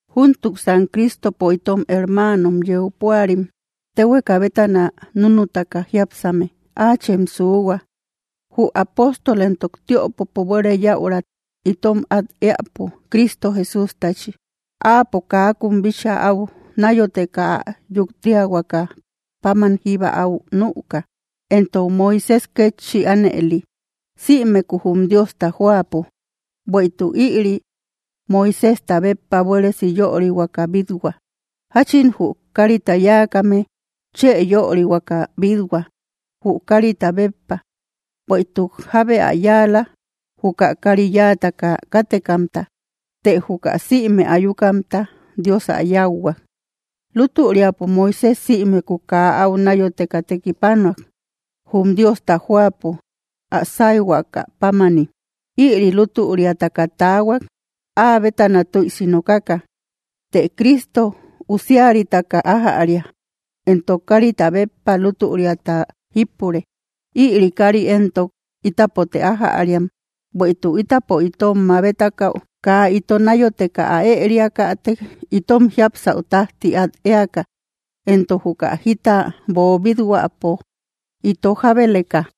Júntuksan Cristopo itom hermaanom yeu púarim, téhueka bétana núnutaka jiápsame, áachem suuhua, jü apóstol entok tiöpopo buere yäutat itom át éäpo, Cristo Jesústachi. Áapo kaakun bíchaa áu náyoteka ä yuktiahuaka páman jíba áu nüka, entok Moisés kétchi ánëli, sïmekuu jum Diosta jóapo. Bueïtuk ïri, Moiséjta béppa buéresi yörihuaka bít-hua, jachin jü kárita yáakame chë yörihuaka bít-hua, jü kárita béppa. Bueïtuk jábe ä yáala, juka kári yáataka kátekamta; të juka sïme ayukamta, Dios ä yáuhuak. Lútüriapo Moisés sïmeku kaa áu náyoteka tekipanuak, jum Diosta jóapo, ä sáyhuaka pámani. Ïri lútüriataka taahuak, áa bétana tüisi nokaka. Të Cristo usiaritaka ájäria, entok kárita béppa lútüriata jípure. Ïri kári éntok ítapote ájäriam, bueïtuk ítapo itom mabetakäu kaa ito náyoteka ä ëriakätek itom jiapsäu tájti át éaka, entok juka jita boobít-huäpo ito jábeleka.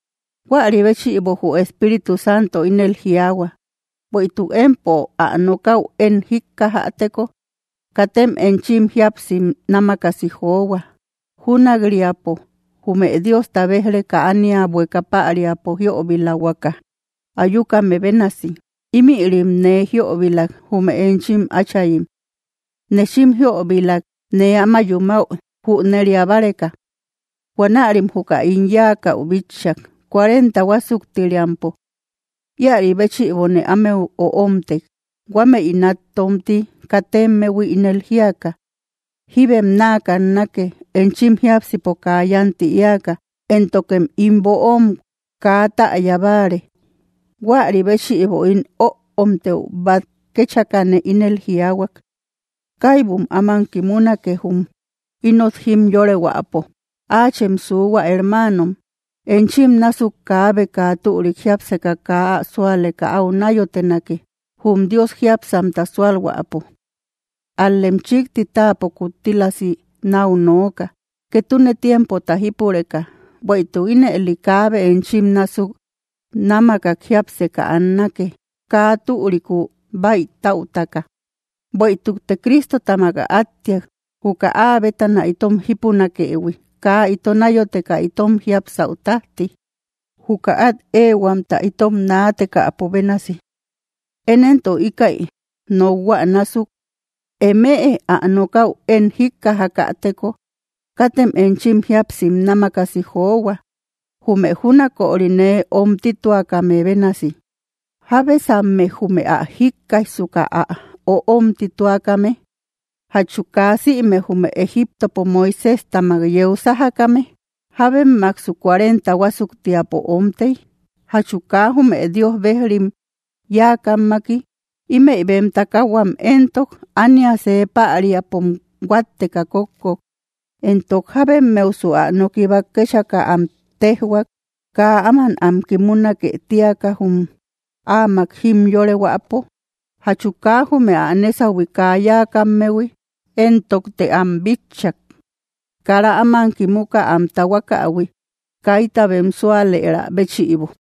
Huäri béchïbo, jü Espíritu Santo ínel jiaahua: Bueïtuk empo ä nokäu én jíkkajäteko, katem enchim jíapsim námakasi johua, júnak‑riapo jume Diosta béj‑reka ánia bueka päriapo jiöbilahuaka ayukame bénasi. Ímïrim nee jiöbilak, jume enchim áchayim. Nechim jiöbilak nee áma yumäu jüneria báreka. Huanärim juka ín yáakäu bitchak, cuarenta huásuktiriampo. Íäri béchïbone ámeu öomtek, huamei nát tómti katemmehui, ínel jíaka: “Jíbem náa kannake, enchim jiápsipo kaa yánti éaka, éntokem ín böom kaa täya báare.” Huäri béchïbo ín öomtëu bát kéchakane ínel jiaahuak: Kaibum áman kimunake jum inot jimyorehuäpo. ¡Áachem suuhua! Hermaanom, enchim násuk kaabe kaa türik jiápseka kaa ä súaleka áu náyotenake, jum Dios jiápsamta súalhuäpo. Ál‑lem chikti táapo kuttílasi náu nooka, ketune tiempota jípureka, bueïtuk ínëli kaabe enchim násuk námakak jiapseka annake, kaa türikuu baïtaütaka. Bueïtukte Cristotamak ä áttiak, juka áa bétana itom jípunakëhui kaa ito nayoteka itom jiapsäu tajti, juka át éehuamta itom naatekäpo bénasi. Én éntok íkäi nokhua násuk: Eme ä nokaü én jíkkajakäteko, katem enchim jíapsim námakasi johua, jume júnaköri nee öomtituakame bénasi. ¿Jábesamme, jume ä jíkkaijsuka, ä öomtituakame? ¿Jachum kaa sïme jume Egiptopo Moiséjtamak yeu sájakame? ¿Jábemmaksu cuarenta huásuktiapo omtey? ¿Jachu kaa jume Dios bejrim yáakammaki? Ímëi bem takahuam éntok ánia see päriapom huátteka kókkok. Entok, ¿jábemmeusu ä noki bát kéchaka am téjhuak, kaa áman am kimunake tíaka, jum áamak jimyorehuäpo? ¿Jachu kaa jume ä nésahui kaa yáakammehui? Entokte am bitchak, kara áman kimuka am tahuakahui, kaita bem súalëra béchïbo.